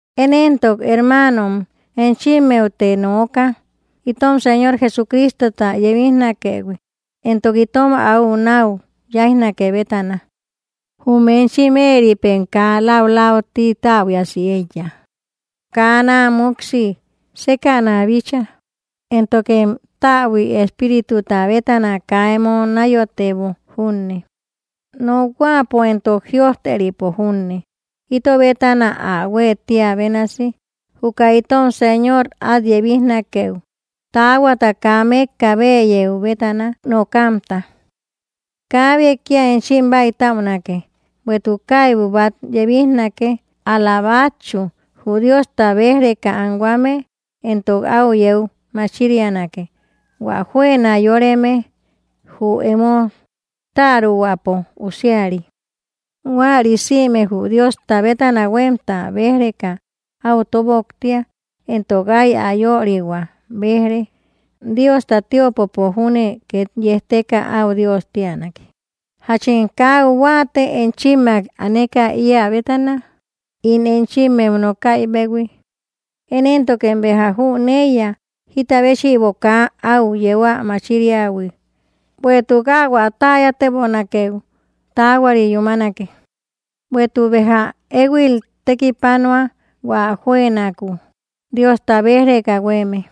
Én éntok, hermaanom, enchimmeute nooka, itom Señor Jesucristota yebijnakëhui entok itom áu náu yáijnake bétana: Jum enchim éeripem kaa läulauti täbuiasi éiya kaa náa múksi sékäna bícha, éntokem täbui espírituta bétana kaa emo náyotebo junne, nokhuäpo entok jïojteripo junne, ito bétana ä huë tía bénasi, juka itom Señor át yebijnakeu taahuata kaa mékka bëyeu bétana nokamta. Kaabe kía enchim bäitäunake; bueïtuk kaibu bát yebijnake, ál‑la bátchu, jü Diosta béj‑reka anhuame; entok áu yeu machirianake, hua juëna yóreme, jü emo täruhuäpo usiari. Huäri sïme jü Diosta bétana huémta béj‑reka áu tóboktia, entok áy ä yörihuäu béj‑re. Diosta tiöpopo júne két yejteka, áu Dios tíanake. ¿Jachem kaa áu huáate, enchimmak aneka íä bétana ín enchimmeu nokaïbehui? Én éntokem béja jüneiya, jita béchïbo kaa áu yeu ä machiriähui, bueïtuk áu ä täyatebonakeu taahuari yúmanake. Bueïtuk béja éhuil tekipanua, hua juënakuu Diosta béj‑reka huéeme;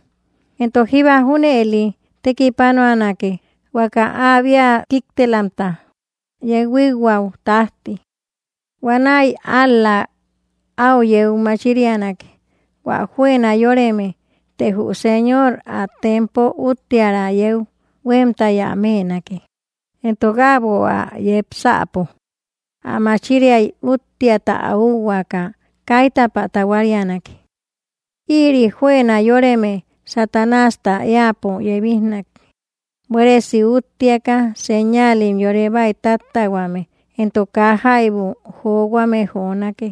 entok jíba junëli tekipanuanake, huaka áabia kíktelamta yeu huíkhuäu tájti. Huanäi ál‑la áu yeu machirianake, hua juëna yóreme, të jü Señor ä tempo úttiära yeu huémtay ä mënake, entok äbo ä yepsäpo ä machiriay úttiata ä úhuaaka kaitapä tahuarianake. Ïri juëna yóreme Satanásta éäpo yebijnake, buéresi útteaka, señaalim yore bäitattähuame, entok kaa jaibu johuame jonake,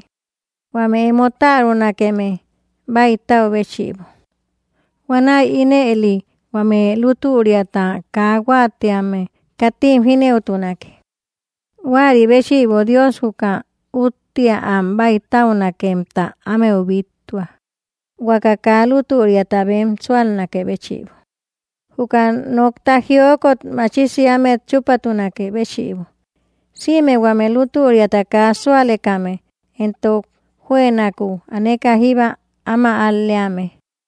huame emo tärunakeme bäitäu béchïbo; huanäi ínëli huame lútüriata kaa huáatíame katim jínëutunake. Huäri béchïbo Dios juka úttea am bäitäunakemta ámeu bíttua, huaka kaa lútüriata bem súalnakë béchïbo, juka nokta jiokot machisi ámet chúpatunakë béchïbo, sïme huame lútüriata kaa súalekame, entok juënakuu aneka jíba áma al‑leame.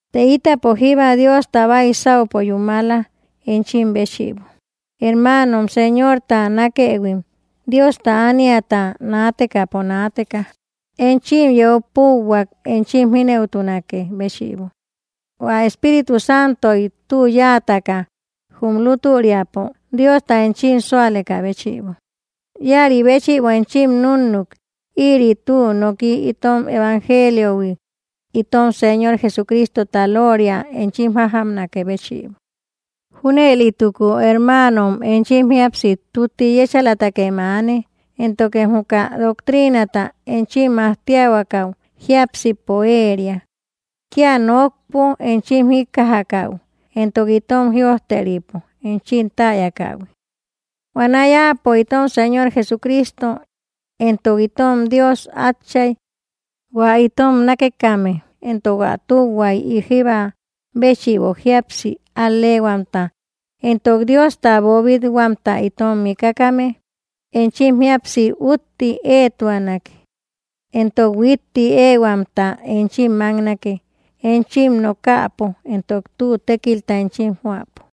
Të ítapo jíba Diosta baisaupo yúmala enchim béchïbo, hermaano Señorta nákëhuim. Diosta ániata naatekäpo naateka enchim yeu púuhuak, enchim jínëutunakë béchïbo, hua Espíritu Santoy tü yáataka, jum lútüriapo Diosta enchim súalekä béchïbo. Íäri béchïbo enchim núnnuk, ïri tü nooki itom evangeliohui, itom Señor Jesucristota lóoria enchim jájamnakë béchïbo. Júnëlituko, hermaanom, enchim jíapsi tutti yéchalatakem aane, éntokem juka doctriinata enchim majtiahuakau jiápsipo ëria, kía nokpo enchim jíkkajakäu entok itom jïojteripo enchim täyakähui. Huanäi Áapo itom Señor Jesucristo, entok itom Dios Átchay, hua itom nákekame, entok ä tühuay jíba béchïbo jíapsi al‑leehuamta entok Diosta boobit-huamta itom mikakame, enchim jíapsi kutti éetuanake, entok huitti éehuamta enchim máknake, enchim nokäpo entok tü tékilta enchim joäpo.